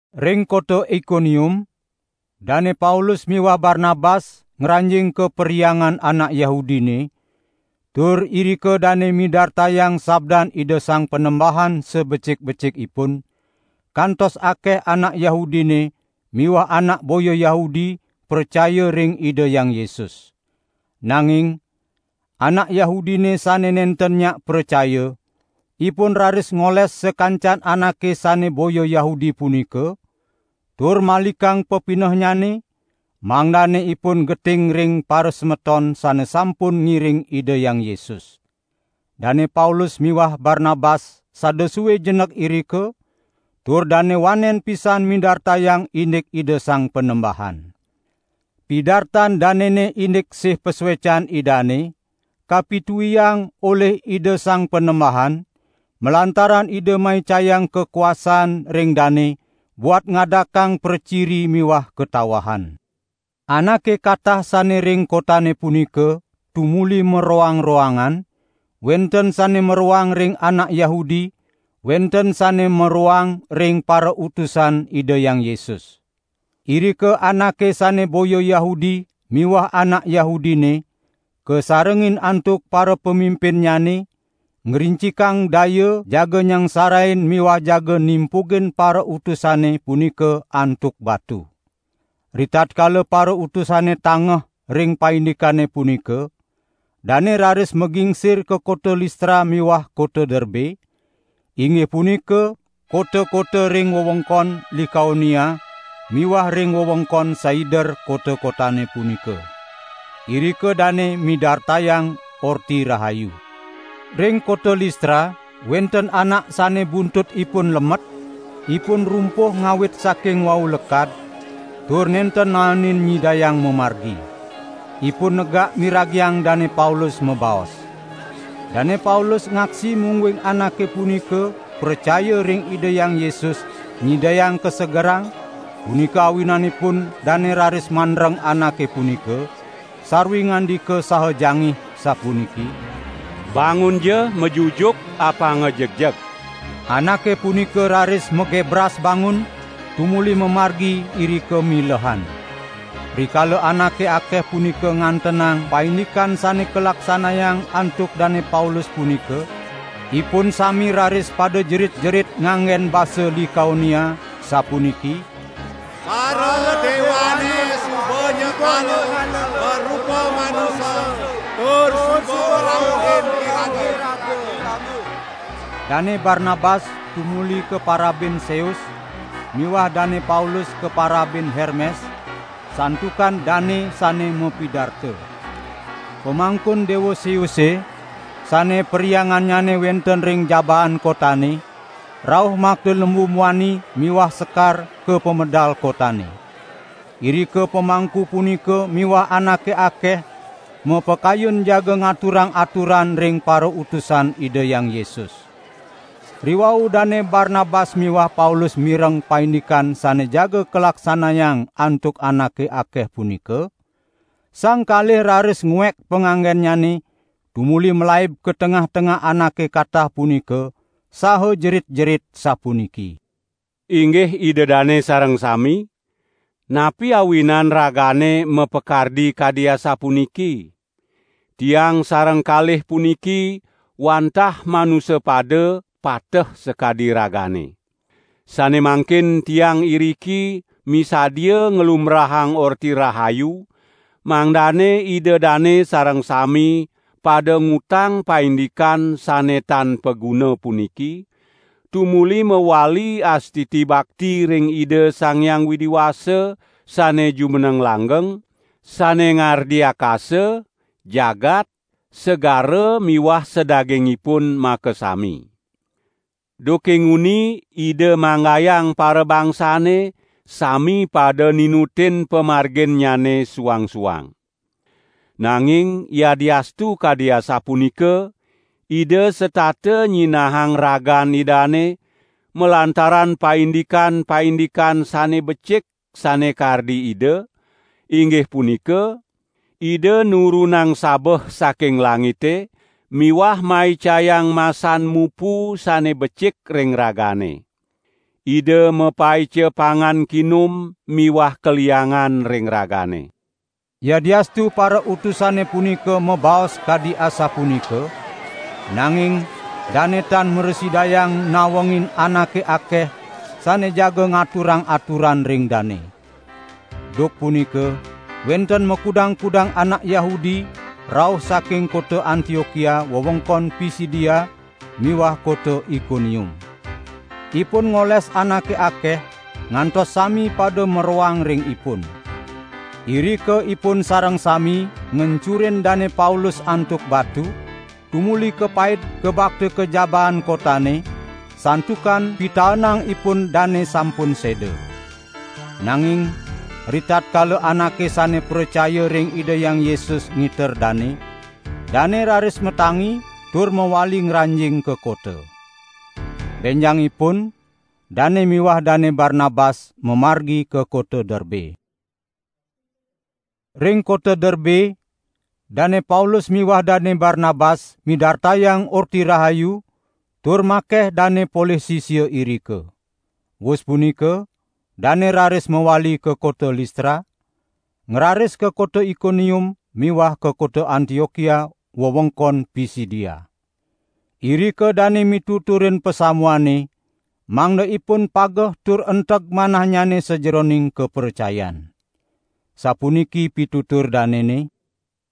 Ring kota Ikonium Dane Paulus miwah Barnabas ngranjing ka perhyangan anak Yahudine, tur irika dane midartayang sabdan Ida Sang Panembahan sabecik-becikipun, kantos akeh anak Yahudine miwah anak boya Yahudi pracaya ring Ida Hyang Yesus. Nanging anak Yahudine sane nenten nyak pracaya, ipun raris ngoles sakancan anake sane boya Yahudi punika, tur malikang pepinehnyane, mangdane ipun geting ring parasemeton sane sampun ngiring Ida Hyang Yesus. Dane Paulus miwah Barnabas sada sue jenek irika, tur dane wanen pisan midartayang indik Ida Sang Panembahan. Pidartan danene indik sih pasuecan Idane, kapituiang olih Ida Sang Panembahan, malantaran Ida maicayang kakuasaan ring dane buat ngadakang praciri miwah katawahan. Anake katah sane ring kotane punika tumuli maroang-roangan, wenten sane maroang ring anak Yahudi, wenten sane maroang ring parautusan Ida Hyang Yesus. Irika anake sane boya Yahudi miwah anak Yahudine, kasarengin antuk parapamimpinnyane, ngrincikang daya jaga nyangsarain miwah jaga nimpugin parautusane punika antuk batu. Ritatkala parautusane tangeh ring paindikane punika, dane raris magingsir ka kota Listra miwah kota Derbe, inggih punika kota-kota ring wewengkon Likaonia miwah ring wewengkon saider kota-kotane punika. Irika dane midartayang Orti Rahayu. Ring kota Listra wenten anak sane buntut ipun lemet, ipun rumpuh ngawit saking wau lekad, tur nenten naenin nyidayang mamargi. Ipun negak miragiang Dane Paulus mabaos. Dane Paulus ngaksi mungguing anake punika pracaya ring Ida Hyang Yesus nyidayang kasegerang, punika awinanipun dane raris mandreng anake punika, sarwi ngandika sada jangih, sapuniki: "Bangunja majujuk apanga jegjeg!" Anake punika raris magebras bangun, tumuli mamargi irika milehan. Rikala anake akeh punika ngantenang paindikan sane kalaksanayang antuk Dane Paulus punika, ipun sami raris pada jerit-jerit nganggen basa Likaonia, sapuniki: "Paradewane suba nyekala marupa manusa tur suba ngrauhin iraga." Dane Barnabas tumuli kaparabin Seus miwah Dane Paulus kaparabin Hermes, santukan dane sane mapidarta. Pamangkun Dewa Seuse, sane perhyangannyane wenten ring jabaan kotane, rauh makta lembu muani miwah sekar ka pemedal kotane. Irika pamangku punika miwah anake akeh mapakayun jaga ngaturang aturan ring parautusan Ida Hyang Yesus. Riwau Dane Barnabas miwah Paulus mireng paindikan sane jaga kalaksanayang antuk anake akeh punika, sang kalih raris nguek panganggennyane tumuli malaib ka tengah-tengah anake katah punika, saha jerit-jerit sapuniki: "Inggih ida dane sareng sami, napi awinan ragane mapakardi kadi asapuniki? Tiang sareng kalih puniki wantah manusa pada, pateh sakadi ragane. Sane mangkin tiang iriki misadia nglumbrahang Orti Rahayu mangdane ida dane sareng sami pada ngutang paindikan sane tan paguna puniki, tumuli mawali astiti bakti ring Ida Sang Hyang Widi Wasa sane jumeneng langgeng, sane ngardi akasa, jagat, segara miwah sadagingipun makasami. Duke nguni Ida manggayang parabangsane sami pada ninutin pamarginnyane suang-suang. Nanging yadiastu kadi asapunika Ida setata nyinahang ragan Idane, malantaran paindikan-paindikan sane becik sane kardi Ida, inggih punika: Ida nurunang sabeh saking langite miwah maicayang masan mupu sane becik ring ragane. Ida mapaica pangan kinum miwah kaliangan ring ragane." Yadiastu parautusane punika mabaos kadi asapunika, nanging dane tan mrasidayang nawengin anake akeh sane jaga ngaturang aturan ring dane. Duk punika wenten makudang-kudang anak Yahudi rauh saking kota Antiokia wewengkon Pisidia miwah kota Ikonium. Ipun ngoles anake akeh ngantos sami pada maroang ring ipun. Irika ipun sareng sami ngencurin Dane Paulus antuk batu, tumuli kapaid kabakta ka jabaan kotane, santukan pitaenang ipun dane sampun seda. Nanging ritatkala anake sane pracaya ring Ida Hyang Yesus ngiter dane, dane raris matangi tur mawali ngranjing ka kota. Benjangipun dane miwah Dane Barnabas mamargi ka kota Derbe. Ring kota Derbe Dane Paulus miwah Dane Barnabas midartayang Orti Rahayu tur makeh dane polih sisia irika. Wus punika dane raris mawali ka kota Listra, ngraris ka kota Ikonium miwah ka kota Antiokia wewengkon Pisidia. Irika dane mituturin pasamuane mangda ipun pageh tur enteg manahnyane sajeroning kapracayan. Sapuniki pitutur danene: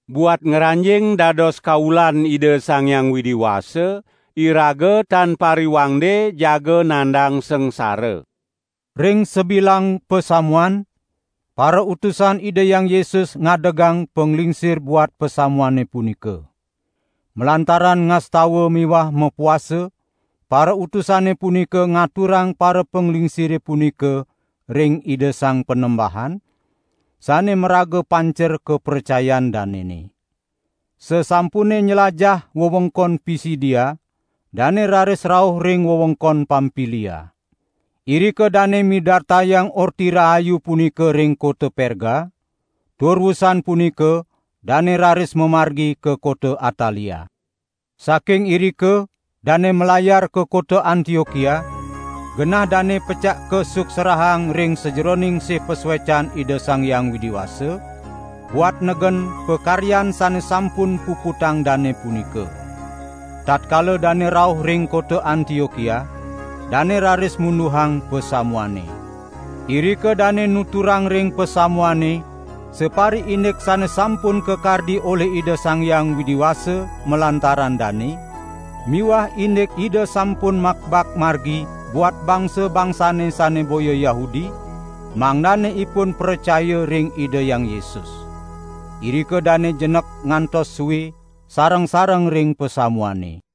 "Buat ngranjing dados kaulan Ida Sang Hyang Widi Wasa, iraga tan pariwangde jaga nandang sangsara." Ring sabilang pasamuan, parautusan Ida Hyang Yesus ngadegang panglingsir buat pasamuane punika. Malantaran ngastawa miwah mapuasa parautusane punika ngaturang parapanglingsire punika ring Ida Sang Panembahan, sane maraga pancer kapracayan danene. Sasampune nylajah wewengkon Pisidia, dane raris rauh ring wewengkon Pampilia. Irika dane midartayang Orti Rahayu punika ring kota Perga tur wusan punika dane raris mamargi ka kota Atalia. Saking irika dane malayar ka kota Antiokia, genah dane pecak kasuksrahang ring sajeroning sih pasuecan Ida Sang Hyang Widi Wasa, buat negen pakaryan sane sampun puputang dane punika. Tatkala dane rauh ring kota Antiokia, dane raris munduhang pasamuane. Irika dane nuturang ring pasamuane sapariindik sane sampun kakardi olih Ida Sang Hyang Widi Wasa malantaran dane miwah indik Ida sampun makbak margi buat bangsa-bangsane sane boya Yahudi mangdane ipun pracaya ring Ida Hyang Yesus. Irika dane jenek ngantos sue sareng-sareng ring pasamuane.